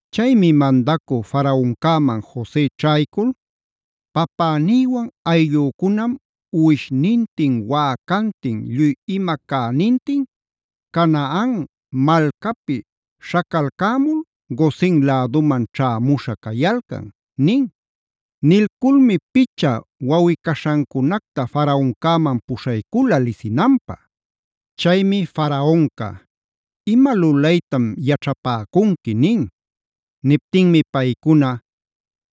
Chaymi mandacü Faraoncäman Jose ćhaycul: “Papänïwan ayllücunam uwishnintin, wäcantin, lluy ima cänintin Canaan malcapi śhacalcämul Gosen läduman ćhämuśha cayalcan” nin. Nilculmi picha wawꞌi-caśhancunacta Faraoncäman puśhaycula lisinanpä. Chaymi Faraonca: “¿Ima lulaytam yaćhapäcunqui?” nin. Niptinmi paycuna: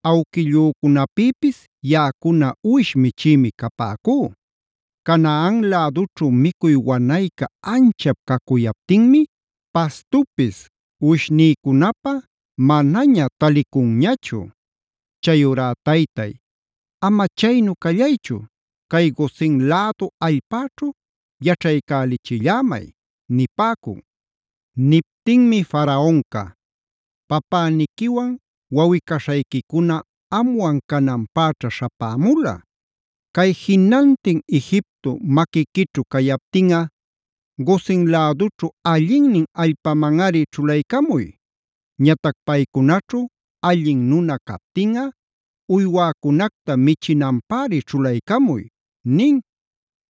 “Awquillücunapïpis, yaꞌacuna uwish michïmi capäcú. Canaan lädućhu micuy wanayca anchap cacuyaptinmi pastupis uwishnïcunapä manaña talicunñachu. Chayurá taytay, ama chaynu callaychu cay Gosen lädu allpäćhu yaćhaycälichillämay” nipäcun. Niptinmi Faraonca: “Papäniquiwan wawꞌi-caśhayquicuna amwan cananpäćha śhapämula. Cay Jinantin Egipto maquiquićhu cayaptinꞌa Gosen lädućhu allinnin allpamanꞌari ćhulaycamuy. Ñatac paycunaćhu allin nuna captinꞌa uywäcunacta michinanpäri ćhulaycamuy” nin.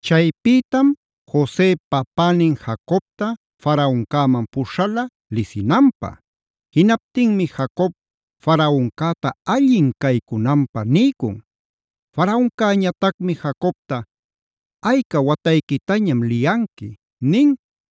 Chaypïtam Jose papänin Jacobta Faraoncäman puśhala lisinanpä. Jinaptinmi Jacob Faraoncäta allin caycunanpä niycun. Faraoncäñatacmi Jacobta: “¿Ayca watayquitañam liyanqui?” nin.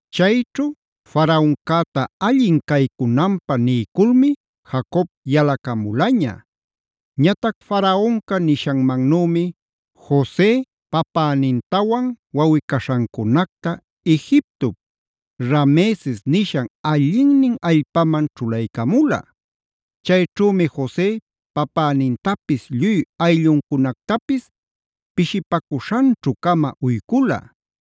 Chayćhu Faraoncäta allin caycunanpä niyculmi Jacob yalacamulaña. Ñatac Faraonca nishanmanümi Jose papänintawan wawꞌi-caśhancunacta Egiptop Rameses nishan allinnin allpaman ćhulaycamula. Chayćhümi Jose papänintapis lluy aylluncunactapis pishipacuśhanćhu-cama uycula.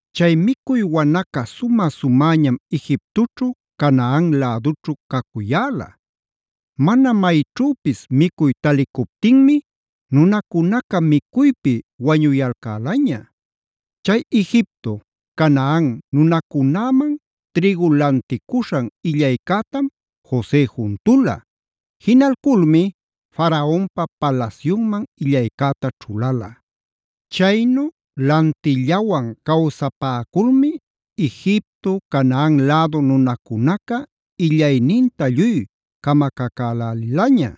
Chay micuy wanaca sumä-sumäñam Egiptoćhu, Canaan lädućhu cacuyäla. Mana mayćhüpis micuy talicuptinmi nunacunaca micuypi wañuyalcälaña. Chay Egipto, Canaan nunacunäman trïgu lanticuśhan illaycätam Jose juntula. Jinalculmi Faraonpa palasyunman illaycäta ćhulala. Chaynu lantillawan cawsapäculmi Egipto, Canaan lädu nunacunaca illayninta lluy camacacälälilaña.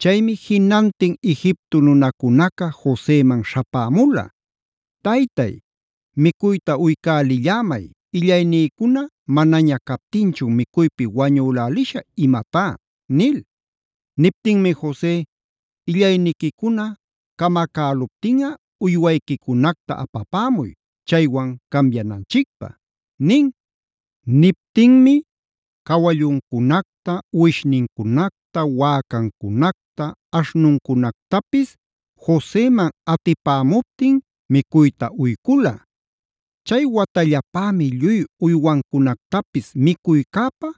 Chaymi jinantin Egipto nunacunaca Joseman śhapämula: “¡Taytay, micuyta uycälillämay! ¡Illaynïcuna manaña captinchun micuypi wañülälishä imatá!” nil. Niptinmi Jose: “Illayniquicuna camacäluptinꞌa uywayquicunacta apapämuy, chaywan cambiananchicpä” nin. Niptinmi cawalluncunacta, uwishnincunacta, wäcancunacta, aśhnuncunactapis Joseman atipämuptin micuyta uycula. Chay watallapämi lluy uywancunactapis micuycäpä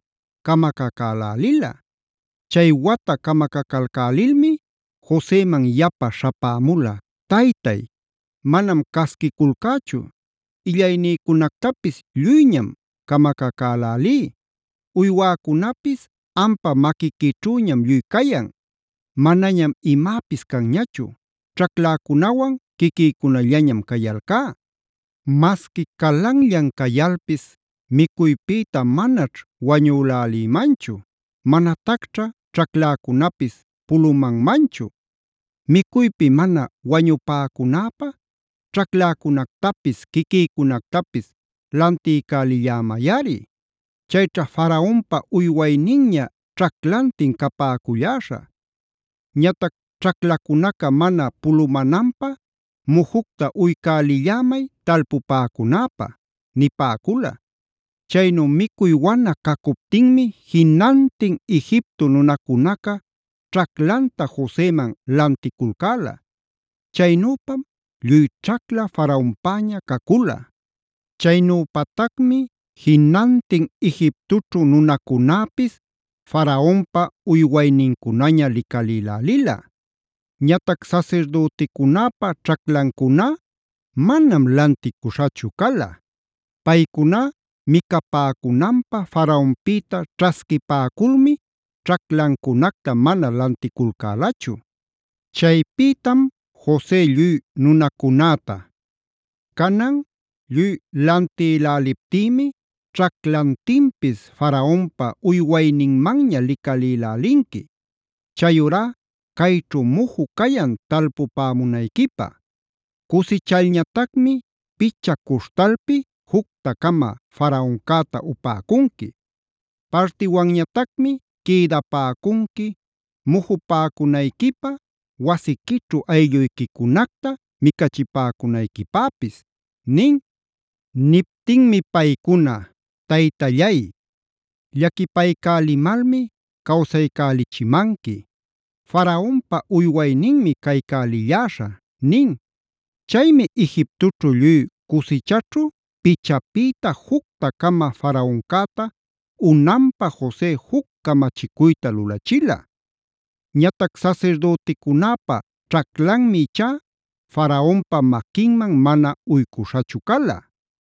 camacacälälila. Chay wata camacacalcälilmi Joseman yapa śhapämula: “Taytay manam casquiculcächu illaynïcunactapis lluyñam camacacälälí, uywäcunapis ampa maquiquićhüñam lluy cayan. Manañam imäpis canñachu, ćhacläcunawan quiquïcunallañam cayalcá. Masqui calanllan cayalpis micuypïta manaćh wañülälïmanchu, manatacćha ćhacläcunapis pulumanmanchu. Micuypi mana wañupäcunäpä ćhacläcunactapis, quiquïcunactapis lantiycälillämayꞌari. Chayćha Faraonpa uywayninña ćhaclantin capäculläśhä. Ñatac ćhaclacunaca mana pulumananpä mujucta uycälillämay talpupäcunäpä” nipäcula. Chaynu micuy wana cacuptinmi jinantin Egipto nunacunaca ćhaclanta Joseman lanticulcäla. Chaynüpam lluy ćhacla Faraonpäña cacula. Chaynüpatacmi jinantin Egiptoćhu nunacunäpis Faraonpa uywaynincunaña licalïlälila. Ñatac sasirdüticunäpa ćhaclancuná manam lanticuśhachu cala. Paycuná micapäcunanpä Faraonpïta ćhasquipäculmi ćhaclancunacta mana lanticulcälachu. Chaypïtam Jose lluy nunacunäta: “Canan lluy lantïläliptïmi ćhaclantinpis Faraonpa uywayninmanña licalïlälinqui. Chayurá cayćhu muju cayan talpupämunayquipä. Cusichalñatacmi picha cuśhtalpi jucta-cama Faraoncäta upäcunqui. Partiwanñatacmi quïdapäcunqui mujupäcunayquipä, wasiquićhu aylluyquicunacta micachipäcunayquipäpis” nin. Niptinmi paycuna: “Taytallay, llaquipaycälimalmi cawsaycälichimanqui. Faraonpa uywayninmi caycälilläśhä” nin. Chaymi Egiptoćhu lluy cusichaćhu pichapïta jucta-cama Faraoncäta unanpä Jose juc camachicuyta lulachila. Ñatac sasirdüticunäpa ćhaclanmi ichá Faraonpa maquinman mana uycuśhachu cala.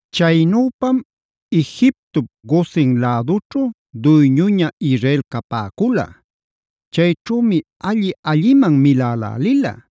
Chaynüpam Egiptop Gosen lädućhu duyñuña Israel capäcula. Chayćhümi alli-alliman milälälila.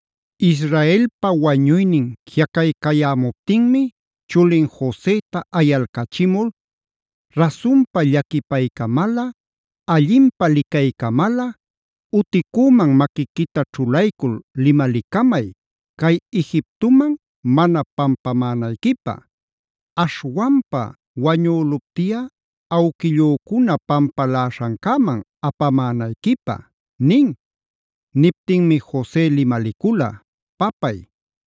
Israelpa wañuynin jiꞌacaycayämuptinmi chulin Joseta ayalcachimul: “Rasunpa llaquipaycamalꞌa, allinpä licaycamalꞌa uticüman maquiquita ćhulaycul limalicamay ‘cay Egiptoman mana pampamänayquipä’. Aśhwanpa wañüluptiꞌa awquillücuna pampaläśhancäman apamänayquipä” nin. Niptinmi Jose limalicula: “Papay,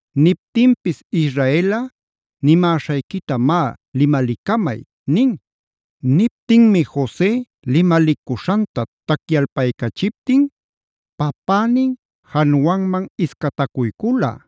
Niptinpis Israelꞌa: “Nimäśhayquita má limalicamay” nin. Niptinmi Jose limalicuśhanta tacyalpaycachiptin, papänin januanman iscatacuycula.